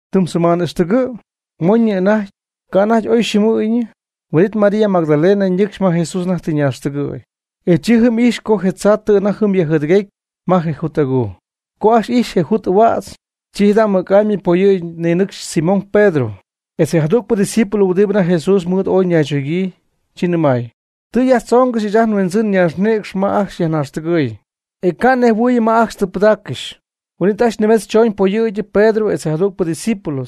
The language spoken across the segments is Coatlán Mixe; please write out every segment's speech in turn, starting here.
Tɨm seman ixtɨgɨ', moñyɨ anajty, ca' anajty oy xɨɨmɨɨyñɨ. Huin'it María Magdalena ñɨcxy ma Jesús anajty tɨ ñaaxtɨgɨ̈y. E chi jɨm ijxy co je tzaa tɨ anajty jɨm yajjɨɨdɨguecy ma je jut aguu. Co ajcxy ijxy je jut ahuädz, chi jada' mɨc'amy poyɨ̈gyɨ ninɨcxy Simón Pedro, etz je jadügpɨ ydiscípulo huɨdibɨ anajty Jesús mɨɨd ooy naychogyii, chi nɨmay: ―Tɨ yajtzoongɨxy ɨɨch ajt nHuindzɨn ñaaxnïcx ma ajcxy yajnaaxtɨgɨy, e ca' nejhuɨɨyɨm ma ajcxy tɨ pɨdaaccɨxy. Huin'it ajcxy nimetz chooñ poyɨ̈gyɨ Pedro etz je jadügpɨ discípulo,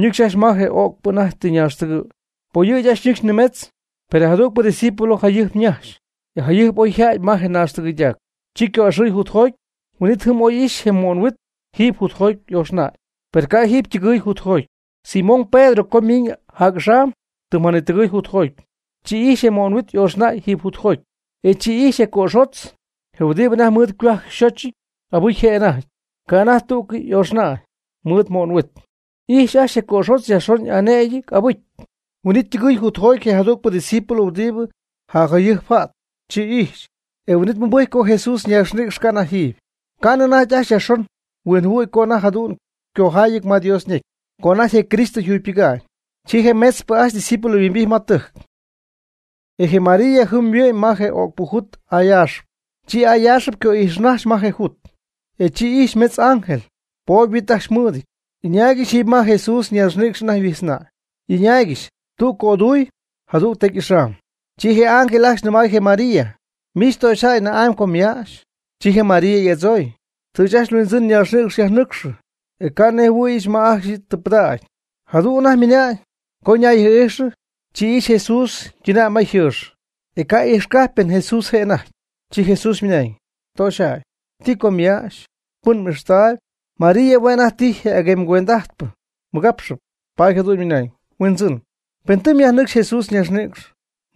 ñɨcxy ajcxy ma je o'cpɨ anajty ñaaxtɨgɨɨy. Poyɨ̈gyɨ ajcxy ñɨcxy nimetz, per je jadügpɨ discípulo jayɨjp ñajxy, e jayɨjp jɨm oyja'ty ma je naaxtɨgɨydac. Chi yco'ixɨɨy jutjoty, huin'it jɨm oy ixy je mo'nhuit jiiby jutjoty y'ooxnäy, per ca' yɨ' jiiby ytɨgɨ̈y jutjoty. Simón Pedro co ymiñ jac'axam, tɨm janitɨgɨɨy jutjoty, chi ijxy je mo'nhuit y'ooxnäy jiiby jutjoty. E chi ijxy je cöxotz, je huɨdibɨ anajty mɨɨd ycohuajc yxochɨty, abɨcy je' anajty, ca' anajty tú'cɨy y'ooxnäy mɨɨd ymo'nhuit. Y'ijx ajcxy je cöxotz yajxon y'anëgyɨty abɨcy. Huin'it ytɨgɨɨy jutjoty je jadügpɨ discípulo huɨdibɨ jacjayɨjp ja't. Chi ijxy, e huin'it mɨbɨjcy co Jesús ñaaxnïcx ca' anajty jiiby. Ca'nɨ anajty ajcxy yajxon huinjɨhuɨ̈y co anajty jadu'n ycojaayɨty ma Dios ñecy, co anajty je Cristo yjugypɨga'ñ. Chi je metzpɨ ajcxy ydiscípulos yhuimbijty ma ytɨjc. E je María jɨm yhuɨ'mɨy ma je o'cpɨ jut ayaaxɨp. Chi ayaaxɨp yco'ixɨy ma je jut. E chi ijxy metz ángel, poob huit ajcxy ymɨɨd, y'ɨñaaygɨxy jiiby ma je Jesús ñaaxnïcx anajty yhuijtznäy, y'ɨñaaygɨxy tüg cöduy, jadüg tecy ɨxaay. Chi je ángel ajcxy nɨmay je María: ―¿Miich töxyjäy na'amy co myäxy? Chi je María y'adzooy: ―Tɨ ajcxy nHuindzɨn ñaaxnïcx yajnɨcxɨ, e ca' nnejhuɨ̈yɨch ma ajcxy tɨ pɨdägy. Jadu'n anajty ymɨna'ñ, co ñayjɨɨ'ijxɨ, chi ijxy Jesús ytɨnäy ma yjɨɨx, e ca' ijxcajpy pen Jesús je' anajty. Chi Jesús ymɨnañ: ―Töxyjäy, ¿ti co myäxy? ¿Pɨn m'ixtaayb? María hue' anajty tijy je aguemy cuend'ajtpɨ mɨgapxɨp, paady jadu'n ymɨnañ: ―Huindzɨn, pen tɨ myajnɨcxy Jesús ñaaxnïcx,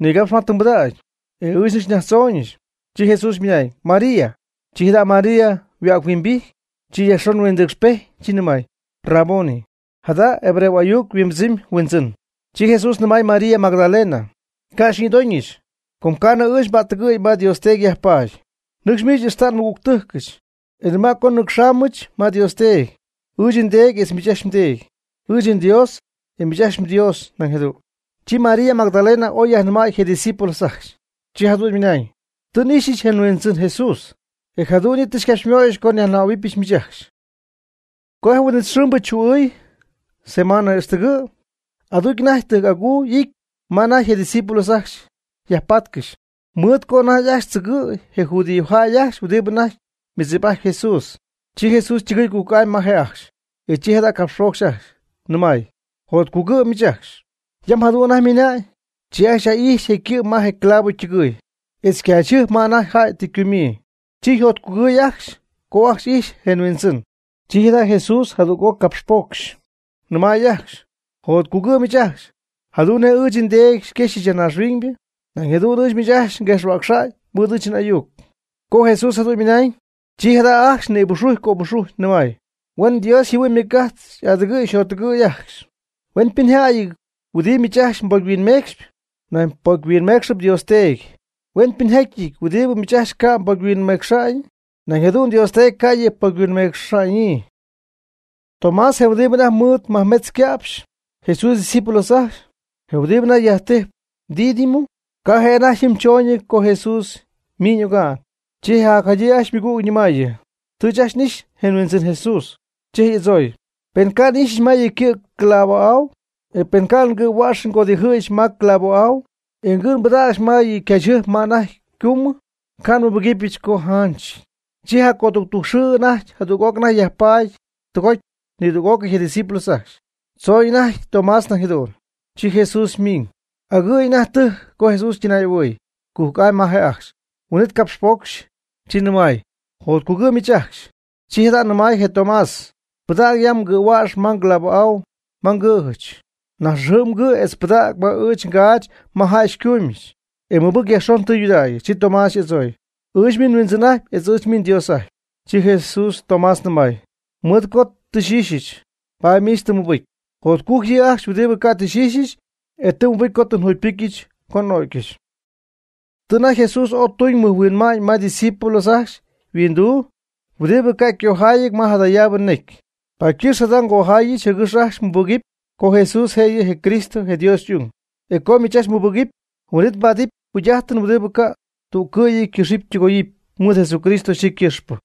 nigapx ma tɨ mbɨdägy, e ɨɨch nɨcxy nyajtzooñɨch. Chi Jesús ymɨnañ: ―María. Chi jada' María yhuäg-huimbijty, chi yajxon huindɨcxpejty, chi nɨmay: ―¡Raboni! ―jada hebreo ayuc yhuimbɨdzɨmy Huindzɨn. Chi Jesús nɨmay María Magdalena: ―Ca' xyñïdooñɨch, com ca'nɨ ɨɨch nba'ttɨgɨ̈y ma Dios Teedy yajpaady. Nɨcx miich ixta' nmɨgügtɨjcɨch, e nɨma' co nnɨcxaamɨch ma Dios Teedy, ɨɨch nDeedy etz miich ajcxy mDeedy, ɨɨch nDios, etz miich ajcxy mDios nañ jadu'n. Chi María Magdalena oy yajnɨmäy je discípulos ajcxy, chi jadu'n nɨmay: ―Tɨ n'ixyɨch je Huindzɨn Jesús, e jadu'n yɨ' tɨ xycapxymöyɨch co nyajnɨmähuɨbyɨch miich ajcxy. Co je huin'it xɨɨmbɨ chuu'ɨɨy seman ixtɨgɨ', aducy anajty tɨjc'aguu y'ity ma anajty je discípulos ajcxy yajpatcɨxy, mɨɨd co anajty ajcxy tzɨgɨ̈y je judíojäy ajcxy huɨdibɨ anajty mɨdzip'ajtp Jesús. Chi Jesús ytɨgɨɨy cujc'amy ma je' ajcxy, e chi jada' capxpocxy ajcxy, nɨmay: ―Jotcugɨ' miich ajcxy. Yam jadu'n anajty ymɨna'ñ, chi ajcxy yaj'ijxy je' ycɨ' ma je clavo ytɨgɨɨy, etz ycaachyjɨjp ma anajty jäy tɨ ycumyii. Chi yjotcugɨɨy ajcxy co ajcxy ijxy je yHuindzɨn. Chi jada' Jesús jadüg'oc capxpoocx, nɨmay ajcxy: ―Jotcugɨ' miich ajcxy. Jadu'n nej ɨɨch nDeedy xyquejxyɨch ya naaxhuiñ, nañ jadu'n ɨɨch miich ajcxy yam nguejxhuäcxy mɨɨd ɨɨch n'ayuc. Co Jesús jadu'n ymɨnañ, chi jada' ajcxy nïbuxujy cöbuxujy nɨmay: ―Huen Dios yjɨhuɨ'ñ ymɨc'ajt xy'adɨgɨ̈y xyjottɨgɨ̈y ajcxy. Huenpɨnjäyɨty huɨdibɨ miich ajcxy mbocyhuinmeecxyp, nañ ypocyhuinmeecxɨpy Dios Teedy. Huenpɨnjäyɨty huɨdibɨ miich ajcxy ca' ypocy mhuinmeecxaanɨ, nañ jadu'n Dios Teedy ca' yɨ' ypocyhuinmeecxa'ñyii. Tomás je' huɨdibɨ anajty mɨɨd majmetz yca'pxy Jesús ydiscípulos ajcxy, je huɨdibɨ anajty yajtijp Dídimo, ca' je' anajty jɨm choonɨty co Jesús ymiñ oga'n. Chi je jacjadyii ajcxy ymɨgüg ñɨmaayɨ: ―Tɨ ɨɨch ajcxy n'ixy je Huindzɨn Jesús. E chi je' y'adzooy: ―Pen ca' n'ixyɨch ma yɨ' ycɨ' je clavo'au, e pen ca' ngɨ̈huäxɨch ngodijɨ̈yɨch ma clavo'au, e ngɨ' nbɨdägyɨch ma ycaachyjɨjp ma anajty ycumyɨty, ca' nmɨbɨgɨpyɨch co yjanchɨty. Chi jacoductujc xɨɨ ajcxy jadüg'oc anajty yajpaady tɨgoty nidüg'ócɨy je discípulos ajcxy. Tzooñ anajty Tomás nañ jadu'n. Chi Jesús ymiñ. Agɨ̈y anajty tɨjc co Jesús ytɨnay'ahuɨɨy cujc'amy ma je' ajcxy. Huin'it ycapxpocxy, chi nɨmay: ―Jotcugɨ' miich ajcxy. Chi jada' nɨmay je Tomás: ―Pɨdäg ya mgɨ̈huäx ma clavo'au ma ngɨ̈jɨch. Najtzxajɨ' mgɨ' etz pɨdäg ma ɨɨch ngaach ma jäy xycumyɨch, e mɨbɨc yajxon tɨydudägy. Chi Tomás y'adzooy: ―Ɨɨch miich nHuindzɨn'ajtyp etz ɨɨch miich nDios'ajtyp. Chi Jesús Tomás nɨmay: ―Mɨɨd co miich tɨ xy'ixyɨch, paady miich tɨ mmɨbɨcy. Jotcujc yɨ' ajcxy huɨdibɨ ca' xy'ixyɨch, e tɨ ymɨbɨcy co tɨ njugypɨcyɨch co n'o'gyɨch. Tɨ anajty Jesús ooy tuñ mɨjhuinma'ñ ma ydiscípulos ajcxy yhuinduu huɨdibɨ ca' ycojaayɨty ma jadayaabɨ necy. Paady ycɨx jada ngojaayɨch jɨgɨx ajcxy mmɨbɨgɨpy co Jesús je' yɨ' je Cristo je Dios y'ung. E co miich ajcxy mmɨbɨgɨpy, huin'it mbaadɨp jugy'ajtɨn huɨdibɨ ca' tüccɨ'yɨ ycɨxɨpy ytɨgoyɨpy mɨɨd Jesucristo yxɨɨ ycɨxpɨ.